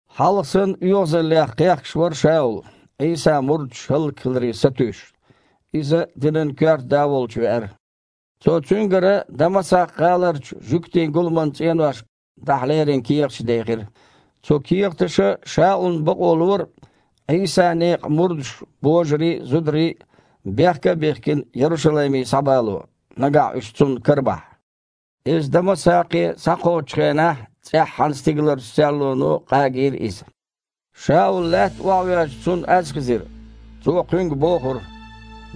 Хьалха санна оьгІазаллех кхехкаш вара Шаул, Іийсан мурдаш хІаллакьхиларе сатуьйсуш. Иза динан коьрта да волчу веара. Цо цуьнгара Дамасакх-гІаларчу жуьгтийн гуламан цІеношка дахьа лерина кехаташ дехира. Цу кехаташа Шаулна бакъо лора Іийсан некъан мурдаш, божарий а, зударий а, бехка а бихкина, Ярушалайме схьабало, нагахь уьш цунна карабахь. Иза Дамасакхе схьакхочучу хенахь, цІеххьана стигаларчу серлоно къагийра иза. Шаул лаьтта охьавоьжча, цунна аз хезира. Цо кхуьнга бохура: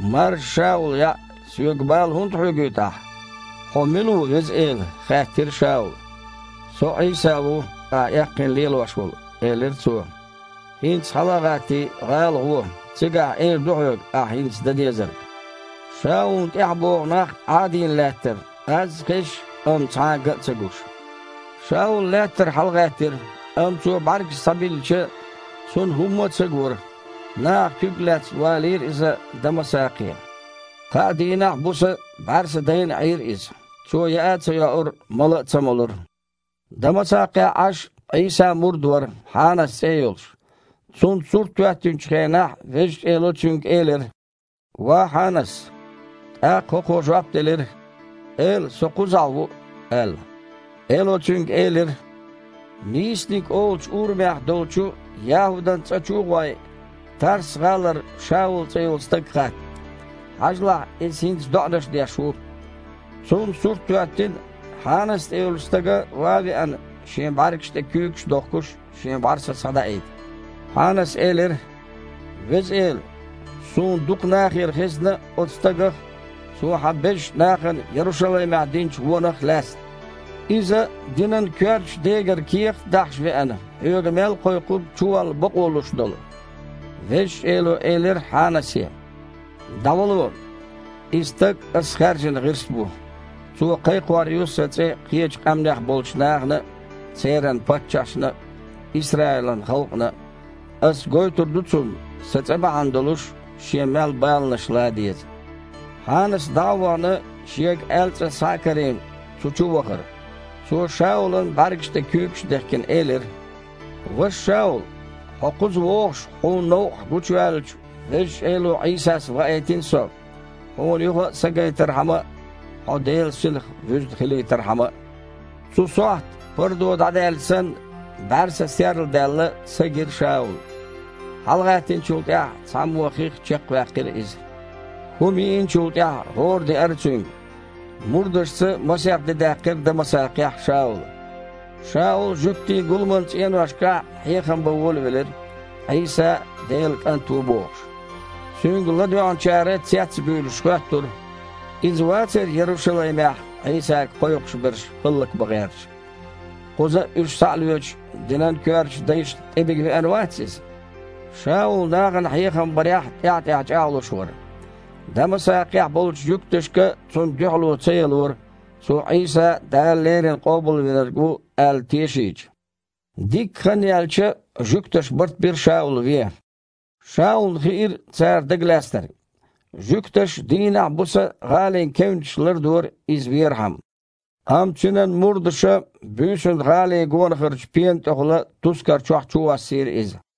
«Маржа Шаул яІ! Соьга бала хІунда хьоьгуьйту ахь?» «Хьо мила ву, Веза Эла?» – хаьттира Шаула. «Со Іийса ву, ахьа эккхийна лелош волу, – элира Цо. ХІинца, хьала а гІаттий, гІала гІо, цигахь эр ду хьоьга ахь хІинца дан дезарг». Шаулна тІаьхьа богІу нах Іадийна лаьттара, аз а хезаш, амма цхьа а ган а ца гуш. Шаул лаьттара хьалагІаьттира, амма цо бІаьргаш схьабиллича, цунна хІумма а ца гора. Наха, куьг а лаьцна, валийра иза Дамасакхе. Кхаа дийнахь а, буса а бІаьрса дайна Іийра иза. Цо яа а ца йоура, мала а ца молура. Дамасакхехь Іаш Іийсан мурд вара, Хьанас цІе а йолуш. Цунна сурт хІоьттинчу хенахь, Везачу Эло цуьнга элира: «Ва Хьанас!» ТІаккха хІокхо жоп делира: «Эла, со кхузахь ву!» – аьлла. Эло цуьнга элира: «„Нийсаниг“ олучу урамехь долчу ЯхІудан цІа чу а гІой, Тарс-гІалара Шаул цІе йолу стаг хатта. Хьажалахь, иза хІинца доІанаш деш ву. Цунна сурт хІоьттина, Хьанас цІе йолчу стага, ван а веана, шен бІаьргаш тІе куьйгаш дохкуш, шен бІаьрса схьадаийта». Хьанаса элира: «Веза Эла, суна дукха нахера хезна оцу стагах а, цо Хьан безачу нахана Ярушалаймехь динчу вонах а лаьцна. Иза динан коьртачу дегара кехат а дахьаш веана, Хьоьга мел кхойкхург чуволла бакъо луш долу». Везачу Эло элира Хьанасе: «ДІавало! И стаг Ас хаьржина гІирс бу. Цо кхайкхор ю Сан цІе кхечу къаьмнех болчу нахана а, церан паччахьашна а, Исраилан халкъана а. Ас гойтур ду цунна, Сан цІе бахьана долуш шен мел баланаш лан деза». Хьанас, дІа а вахана, шега аьлла цІа схьа а карийна, цу чу вахара. Цо, Шаулан бІаьргаш тІе куьйгаш а дехкина, элира: «Ваша Шаул, хьо кхуза вогІуш, хьуна новкъахь гучуваьллачу Везачу Эло Іийсас ваийтина со, хьуна юха а са гайтархьама а, хьо Делан Синах вуьзна хилийтархьама а». Цу сохьта, пардо дІадаьлча санна, бІаьрса серладаьлла, са гира Шаулна. ХьалагІаьттинчул тІаьхьа цхьаммо хих чекхваьккхира иза. ХІума йиинчул тІаьхьа гІора деара цуьнга. Мурдашца масех де даьккхира Дамасакхехь Шаула. Шаул жуьгтийн гуламан цІеношкахь хьехам бан волавелира, Іийса Делан КІант ву бохуш. Цуьнга ладоьгІначара, цец а буьйлуш, хоьттура: «Иза вацара Ярушалаймехь Іийсага кхойкхуш берш хІаллакбан гІерташ? Кхуза а уьш, схьа а лоьцуш, динан коьртачу дайшна тІебига веана вац иза?» Шаул нахана хьехам барехь тІаьхь-тІаьхьа чІагІлуш вара. Дамасакхехь болчу жуьгташка цунна дуьхьало ца ялора, цо Іийса Дала леррина Къобалвинарг ву аьлла тешийча. Дикка хан яьлча, жуьгташа барт бира Шаул вен. Шаулна хиира цара дагалаьцнарг. Жуьгташа дийнахь а, буса а гІалин кевнаш лардора иза верхьама. Амма цуьнан мурдаша буьйсанна гІалин гонахарчу пена тІехула тускар чохь чувоссийра иза.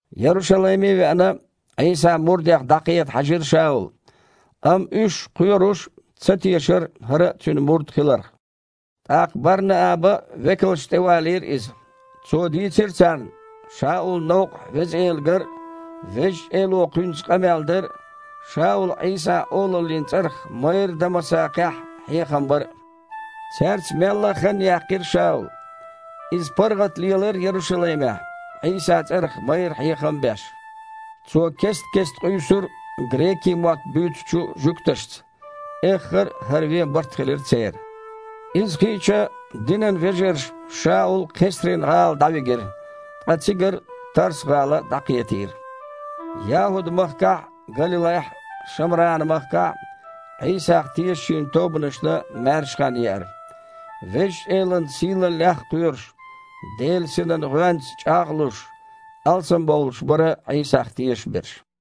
Ярушалайме а веана, Іийсан мурдех дІакхета хьаьжира Шаул, амма уьш, кхоьруш, ца тешара хІара а Цуьнан мурд хиларх. ТІаккха Бар-Нааба векалшна тІевалийра иза. Цо дийцира царна, Шаулна новкъахь Веза Эла гар а, Везачу Эло кхуьнца къамел дар а, Шаула Іийсан олаллин цІарах майрра Дамасакхехь хьехам бар а. Цаьрца мелла а хан яьккхира Шаула. Иза паргІат лелара Ярушалаймехь, Іийсан цІарах майрра хьехам а беш. Цо кест-кеста къуьйсура грекийн мотт буьйцучу жуьгташца. Эххар а хІара вен барт хилира церан. Иза хиъча, динан вежарша Шаул Кхесрин-гІала дІавигира, ткъа цигара Тарс-гІала дІакхетийра. ЯхІуд-махкахь а, Галилайхь а, Шамран-махкахь а Іийсах тешачийн тобанашна маьрша хан еара. Везачу Элан сийлаллех а кхоьруш, Делан Синан гІоьнца чІагІ а луш, алсамбовлуш бара Іийсах тешаш берш.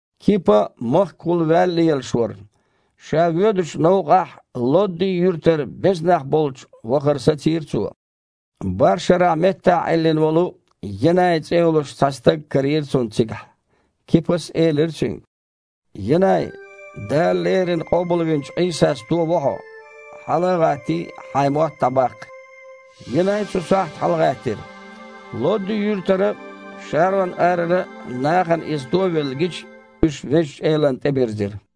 Кипа махкахула ваьлла лелаш вара. Ша воьдучу новкъахь Лодди-юьртара беза нах болчу вахар сацийра цо. БархІ шарахь меттахь Іиллина волу Енай цІе йолуш цхьа стаг карийра цунна цигахь. Кипас элира цуьнга: «Енай! Дала леррина къобалвинчу Іийсас тово хьо. Хьала а гІаттий, хьайн мотт дІабаккха». Енай цу сохьта хьалагІаьттира. Лодди-юьртара а, Шарон-арара а нахана иза туовелла гича, уьш Везачу Элана тІебирзира.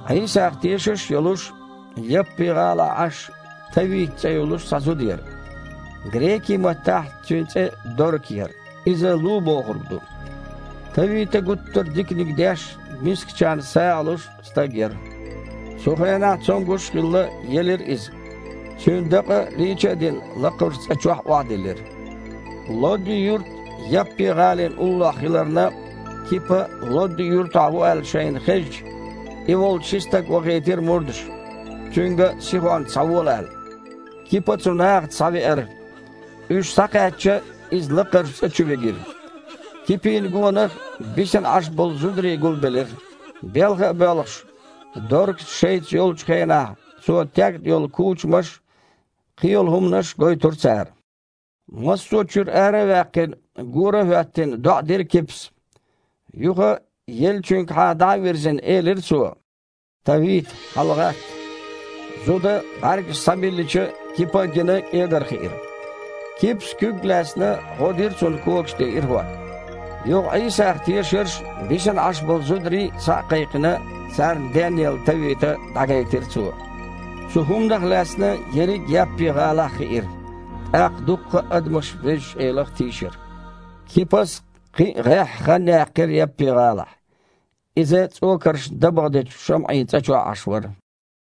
Іийсах тешаш а йолуш, Яппи-гІалахь Іаш Тавита цІе йолуш цхьа зуда яра. (Грекийн маттахь цуьнан цІе Дорка яра, иза «лу» бохург ду.) Тавита гуттар а диканиг деш а, мискачарна сагІа луш а стаг яра. Цу хенахь, цомгуш а хилла, елира иза. Цуьнан дакъа, лийча а дина, лакхарчу цІа чохь охьадиллира. Лодди-юрт Яппи-гІалина уллохь хиларна, Кипа Лодди-юртахь ву аьлла шайна хезча, и волчу ши стаг вахийтира мурдаша, цуьнга сихонца схьавола аьлла. Кипа цу нахаца схьавеара. Уьш схьакхаьчча, иза лакхарчу цІа чу вигира. Кипина гонах бисина Іаш болу зударий гулбелира. Белха а боьлхуш, Доркас шайца йолчу хенахь цо тегна йолу кучамаш а, кхин йолу хІуманаш а гойтура цара. Массо а чуьра ара а ваьккхина, гора а хІоьттина, доІа дира Кипас. Юха, еллачуьнгахьа дІа а вирзина, элира цо: «Тавита, хьалагІатта!» Зуда, бІаьргаш схьабиллича, Кипа а гина, кІегархиира. Кипас, куьг а лаьцна, гІо дира цунна когаш тІе ирахІотта. Юха Іийсах тешарш а, бисина Іаш болу зударий а схьа а кхайкхина, царна денъелла Тавита дІагайтира цо. Цу хІуманах лаьцна ерриг а Яппи-гІалахь хиира, тІаккха дуккха а адамаш Везачу Элах тийшира. Кипас кхин а гІеххьа хан яьккхира Яппи-гІалахь. Иза цІокаршна дабагІа дечу ШамІин цІа чохь Іаш вара.